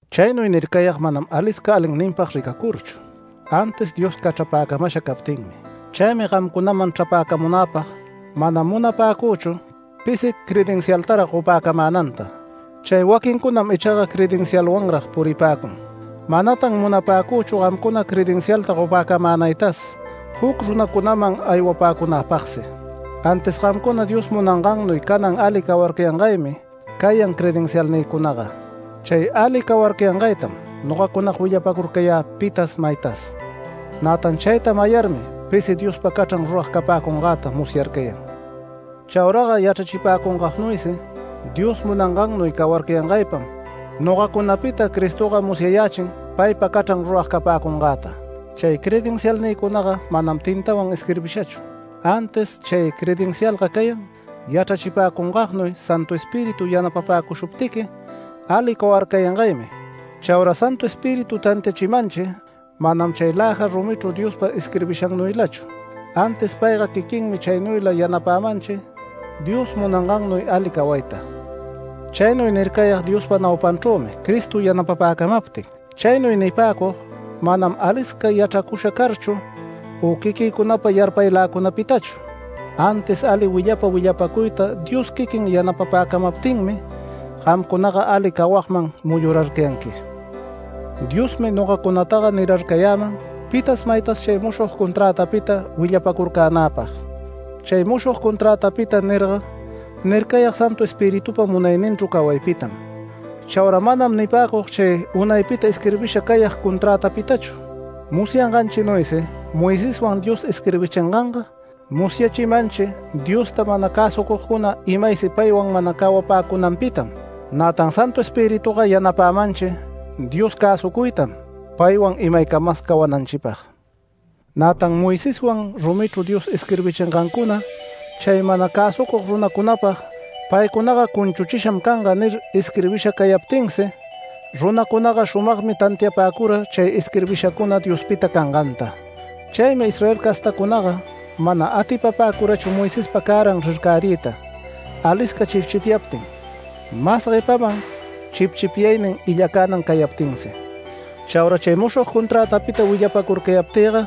Chaynuy nircayag manam alisca alinninpag ricacurchu, antis Dios cachrapäcamasha captinmi. Chaymi gamcunaman chrapäcamunäpag, mana munapäcüchu pisi credencialtarag gopäcamänanta, chay waquincunam ichaga credencialwanrag puripäcun. Manatan munapäcüchu gamcuna credencialta gopäcamänaytas juc runacunaman aywapäcunapagsi. Antis gamcuna Dios munangannuy canan ali cawarcayangaymi cayan credencialnïcunaga, chay ali cawarcayangaytam nogacuna willapäcurcayä pitas maytas. Nätan chayta mayarmi pisi Diospa cachran rurag capäcungäta musyarcayan. Chauraga yachrachipäcungagnuysi Dios munangannuy cawarcayangaypam nogacunapita Cristoga musyayächin paypa cachran rurag capäcungäta. Chay credencialnïcunaga manam tintawan isquirbishachu, antis chay credencialga cayan yachrachipäcungagnuy Santu Espíritu yanapapäcushuptiqui ali cawarcayangaymi. Chaura Santu Espíritu tantiachimanchi manam chay läja rumichru Diospa isquirbishannuylachu, antis payga quiquinmi chaynuyla yanapämanchi Dios munangannuy ali cawayta. Chaynuy nircayag Diospa naupanchrümi Cristo yanapapäcamaptin. Chaynuy nipäcug manam alisca yachracusha carchu u quiquïcunapa yarpayläcunapitachu, antis ali willapa willapacuyta Dios quiquin yanapapäcamaptinmi gamcunaga ali cawagman muyurarcayanqui. Diosmi nogacunataga nirarcayäman pitas maytas chay mushog conträtapita willapacurcänäpag. Chay mushog conträtapita nirga nircayag Santu Espiritupa munayninchru cawaypitam. Chaura manam nipäcug chay unaypita isquirbisha cayag conträtapitachu. Musyanganchinuysi Moiseswan Dios isquirbichinganga musyachimanchi Diosta mana cäsucugcuna imaysi paywan mana cawapäcunanpitam. Nätan Santu Espirituga yanapämanchi Dios cäsucuytam paywan imaycamas cawananchipag. Nätan Moiseswan rumichru Dios isquirbichingancuna chay mana cäsucug runacunapag “Paycunaga cunchuchisham canga” nir isquirbisha cayaptinsi runacunaga shumagmi tantiapäcura chay isquirbishacuna Diospita canganta. Chaymi Israel castacunaga mana atipapäcurachu Moisespa cäran rircariyta alisca chipchipyaptin, mas guepaman chipchipyaynin illacänan cayaptinsi. Chaura chay mushog conträtapita willapacurcayaptïga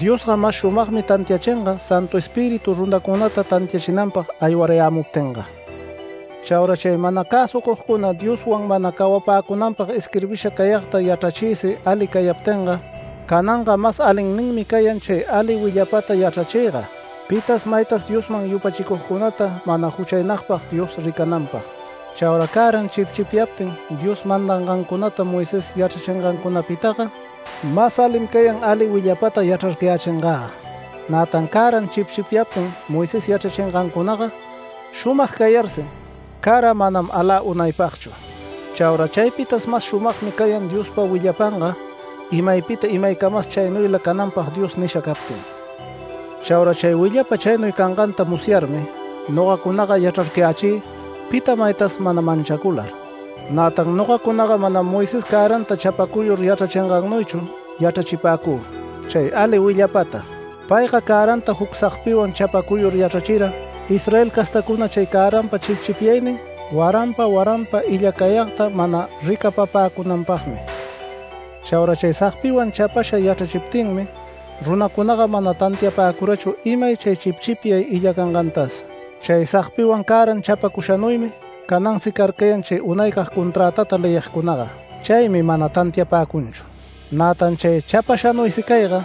Diosga mas shumagmi tantiachinga Santu Espíritu runacunata tantiachinanpag aywarayämuptinga. Chaura chay mana cäsucugcuna Dioswan mana cawapäcunanpag isquirbisha cayagta yachrachiysi ali cayaptinga, cananga mas alinninmi cayan chay ali willapata yachrachïga pitas maytas Diosman yupachicugcunata mana juchaynagpag Dios ricananpag. Chaura cäran chipchipyayaptin Dios mandangancunata Moisés yachrachingancunapitaga, mas alim cayan ali willapata yachrarcayächingäga. Nätan cäran chipchipyayaptin Moisés yachrachingancunaga shumag cayarsi, cara manam alä unaypagchu. Chaura chaypitas mas shumagmi cayan Diospa willapanga imaypita imaycamas chaynuyla cananpag Dios nisha captin. Chaura chay willapa chaynuy canganta musyarmi nogacunaga yachrarcayächï pita maytas mana manchacular. Nätan nogacunaga manam Moisés cäranta chapacuyur yachrachingannuychu yachrachipäcü, chay ali willapata. Payga cäranta juc sagpiwan chapacuyur yachrachira, Israel castäcuna chay cäranpa chipchipyayagnin waranpa waranpa illacayagta mana ricapapäcunanpagmi. Chaura chay sagpiwan chapasha yachrachiptinmi runacunaga mana tantiapäcurachu imay chay chipchipyay illacangantas. Chay sagpiwan cäran chapacushanuymi canansi carcayan chay unaycag conträtata leyigcunaga, chaymi mana tantiapäcunchu. Nätan chay chapashanuysi cayga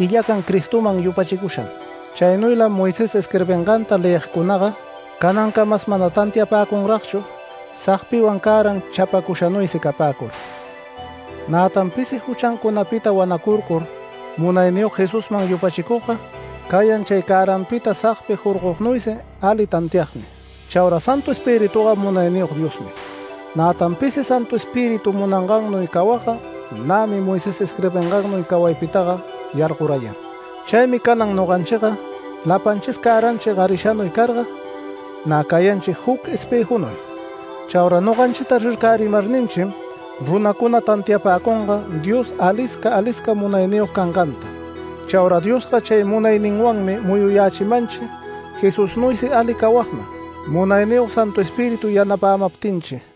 illacan Cristoman yupachicusham. Chaynuylam Moisés isquirbinganta leyigcunaga canancamas mana tantiapäcunragchu sagpiwan cäran chapacushanuysi capäcur. Nätan pisi juchancunapita wanacurcur Munayniyog Jesusman yupachicugga cayan chay cäranpita sagpi jorgognuysi ali tantiagmi. Chaura Santu Espirituga Munayniyog Diosmi. Nätan pisi Santu Espíritu munangannuy cawagga nämi Moisés isquirbingannuy cawaypitaga yargorayan. Chaymi canan noganchiga lapanchis cäranchi garishanuy carga nä cayanchi juc espëjunuy. Chaura noganchita rircärimarninchim runacuna tantiapäcunga Dios alisca alisca munayniyog canganta. Chaura Diosga chay munayninwanmi muyuyächimanchi Jesusnuysi ali cawagman Munayniyog Santu Espíritu yanapämaptinchi.